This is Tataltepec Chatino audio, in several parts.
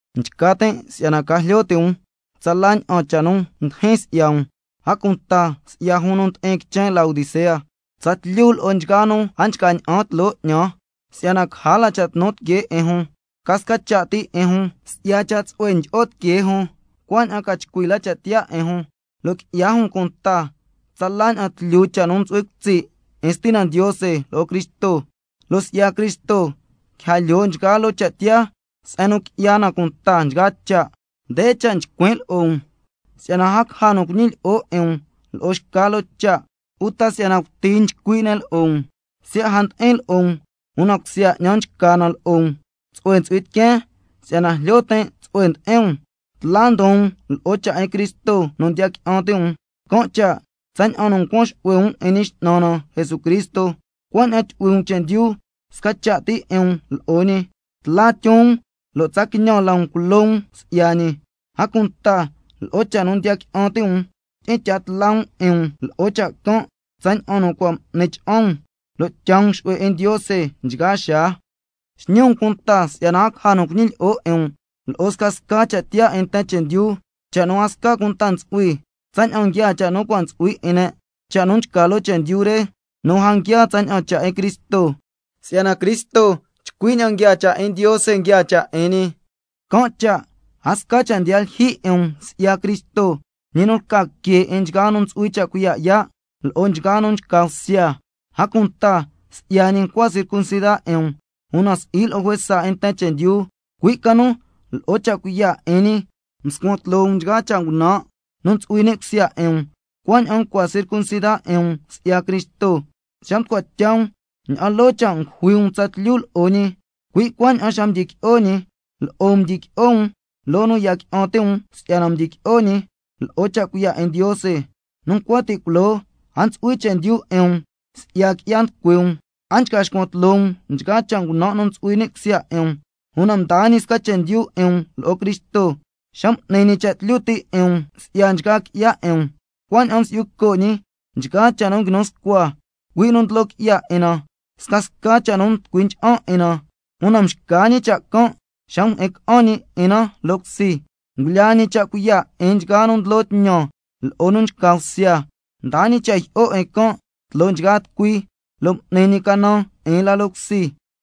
Nchca tin' si'yana ca jlyo ti' um tsala ña'an cha' nu ndijin si'ya um, a cunta si'ya jun nu ndi'in quichen Laodicea, tsatlyu lo'o nchgaa nu a nchca ña'an tloo 'ñan, si'yana caja la cha' tnu tiquee 'in jun, ca sca cha' ti 'in jun si'ya cha' tsu'hue ndyi'o tiquee jun, cuaña'an ca chcui la cha' tiyaa 'in jun, lo' qui'ya jun cunta tsala ña'an tlyu cha' nu yu'hui cutsi' 'in Stina Ndiose lo'o Cristo, lo' si'ya Cristo quija lyoo nchgaa loo cha' tiyaa se'en nu qui'ya na cunta nchgaa cha'. Nde cha' nchcuin' lo'o um si'yana a caja nu cuñilyi'o 'in um lo'o xca loo cha', uta si'yana cuti nchcui' ne' lo'o um. Siya' a ndi'in lo'o um, una cusya 'ñan nchca na lo'o um, tsu'hue ntsu'hui tiqueen si'yana jlyo tin' tsu'hue ndi'in um, tla ndon um lo'o cha' 'in Cristo nu ndiya qui'an ti' um. Can' cha' tsaña'an nu ncuan xu'hue um 'in Ñi X'nan na Jesucristo, cui' cuaña'an tyu'hui um chendyu sca cha' ti 'in um lo'o ñi, tla tyon um lo' tsa quiñan la um culo um si'ya ñi, a cunta lo'o cha' nu ndiya qui'an ti' um, tyi'in tya tla um 'in um lo'o cha' can' tsaña'an nu cua' m'ni cha'an um, lo' tyaa um xu'hue 'in Ndiose nchgaa xaa. Xñi um cunta si'yana a caja nu cuñilyi'o 'in um lo'o scasca cha' tiyaa 'in nten chendyu, cha' nu a sca cunta ntsu'hui, tsaña'an nguiaa cha' nu cua' ntsu'hui 'in ne', cha' nu nchca loo chendyu re, lo' si'i tsaña'an nguiaa cha' 'in Cristo. Si'yana Cristo chcui ña'an nguiaa cha' 'in Ndiose nguiaa cha' 'in ñi, can' cha' a sca cha' ndiya lyijyi 'in um si'ya Cristo, ñi nu lca que 'in nchgaa nu ntsu'hui cha' cuiya' yaa' lo'o nchgaa nu nchca bsya. A cunta si'ya ñi ncua circuncida 'in um, una si'i lo'o juesa 'in nten chendyu, cui' ca nu lo'o cha' cuiya' 'in ñi mscuan tloo um nchgaa cha' ngunan' nu ntsu'hui ni' cusya 'in um, cuaña'an ncua circuncida 'in um si'ya Cristo. Xa mducua tya um ña'an loo cha' ngujui um tsatlyu lo'o ñi, cui' cuaña'an xa mdyiqui'o ñi, lo'o um mdyiqui'o um, loo nu ya qui'an ti' um si'yana mdyiqui'o ñi lo'o cha' cuiya' 'in Ndiose. Nu ncua ti' culoo a ntsu'hui chendyu 'in um si'ya qui'ya nducui um, a nchca xcuan tloo um nchgaa cha' ngunan' nu ntsu'hui ni' cusya 'in um, una mdaa ñi sca chendyu 'in um lo'o Cristo xa m'ni ñi cha' tlyu ti' 'in um si'ya nchgaa qui'ya 'in um, cuaña'an msi'yu co' ñi nchgaa cha' nu nguinu scua, cui' nu ndlo qui'ya 'in na, scasca cha' nu nducui ncha'an 'in na, una mxca ñi cha' can' xa mjyi'in ca'an ñi 'in na loo cusi, ngulyaa ñi cha' cuiya' 'in nchgaa nu ndlo tñan lo'o nu nchca bsya, mdaa ñi cha' jyi'o 'in can' tloo nchgaa tucui, lo' m'ni ñi canan 'in la loo cusi.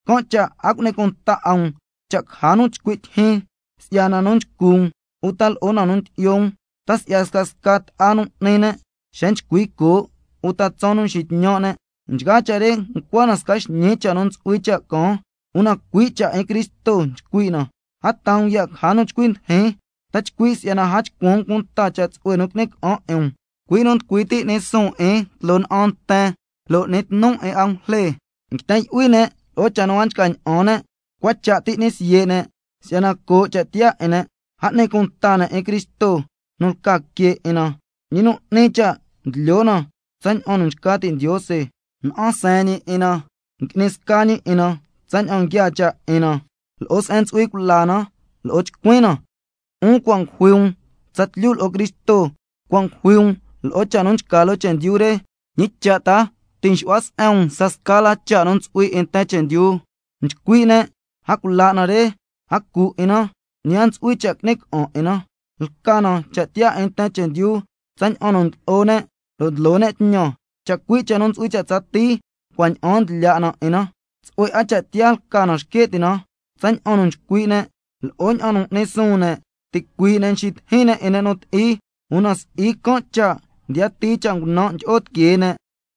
Can' cha' a cu'ni cunta 'a um cha' caja nu chcui' tyijyin si'ya na nu nchcu um, uta lo'o na nu ndyi'yo um, ta si'ya scasca ta'a nu n'ni ne', xa nchcui coo', uta tsaan nu nxitñan' ne', nchgaa cha' re ncua na sca xñii cha' nu ntsu'hui cha' caan, una cui' cha' 'in Cristo nchcui' na. A taa um ya' caja nu chcui ndijin, ta chcui' si'yana a chcuan um cunta cha' tsu'hue nu qui'ni ca'an 'in um, cui' nu nducui ti' n'ni suun 'in tloo na'an nten lo' n'ni tnu 'in angujle, nguiten yu'hui ne' lo'o cha' nu a nchca ña'an ne', cua cha' ti ngui'ni siye' ne' si'yana coo' cha' tiyaa 'in ne'. A n'ni cunta ne' 'in Cristo nu lca Que 'in na, ñi nu n'ni cha' ndlyo na tsaña'an nu nchca ti' Ndiose, na'an seen ñi 'in na, ngui'ni sca ñi 'in na tsaña'an nguiaa cha' 'in na lo'o se'en ntsu'hui cula na lo'o chcuin na. 'Un cua' ngujui um tsatlyu lo'o Cristo, cua' ngujui um lo'o cha' nu nchca loo chendyu re. ¿Ñi cha' ta ti' nxu'hua se'en um scasca la cha' nu ntsu'hui 'in nten chendyu? Nchcui' ne': A cula' na re, a cu 'in na, ñi a ntsu'hui cha' qui'ni ca'an 'in na, (lca na cha' tiyaa 'in nten chendyu tsaña'an nu ndlo'o ne' lo' ndlo ne' tñan), chacui' cha' nu ntsu'hui cha' tsatii cua' ña'aan ndlya' na 'in na. Tsu'hue 'a cha' tiyaa lca na xque' ti' na tsaña'an nu nchcui' ne' lo'o ña'an nu n'ni suun ne', ticuii' ne' nxitijin ne' 'in ne' nu ti'i, una si'i can' cha' ndiyatii cha' ngunan' ndyi'o tiquee ne'.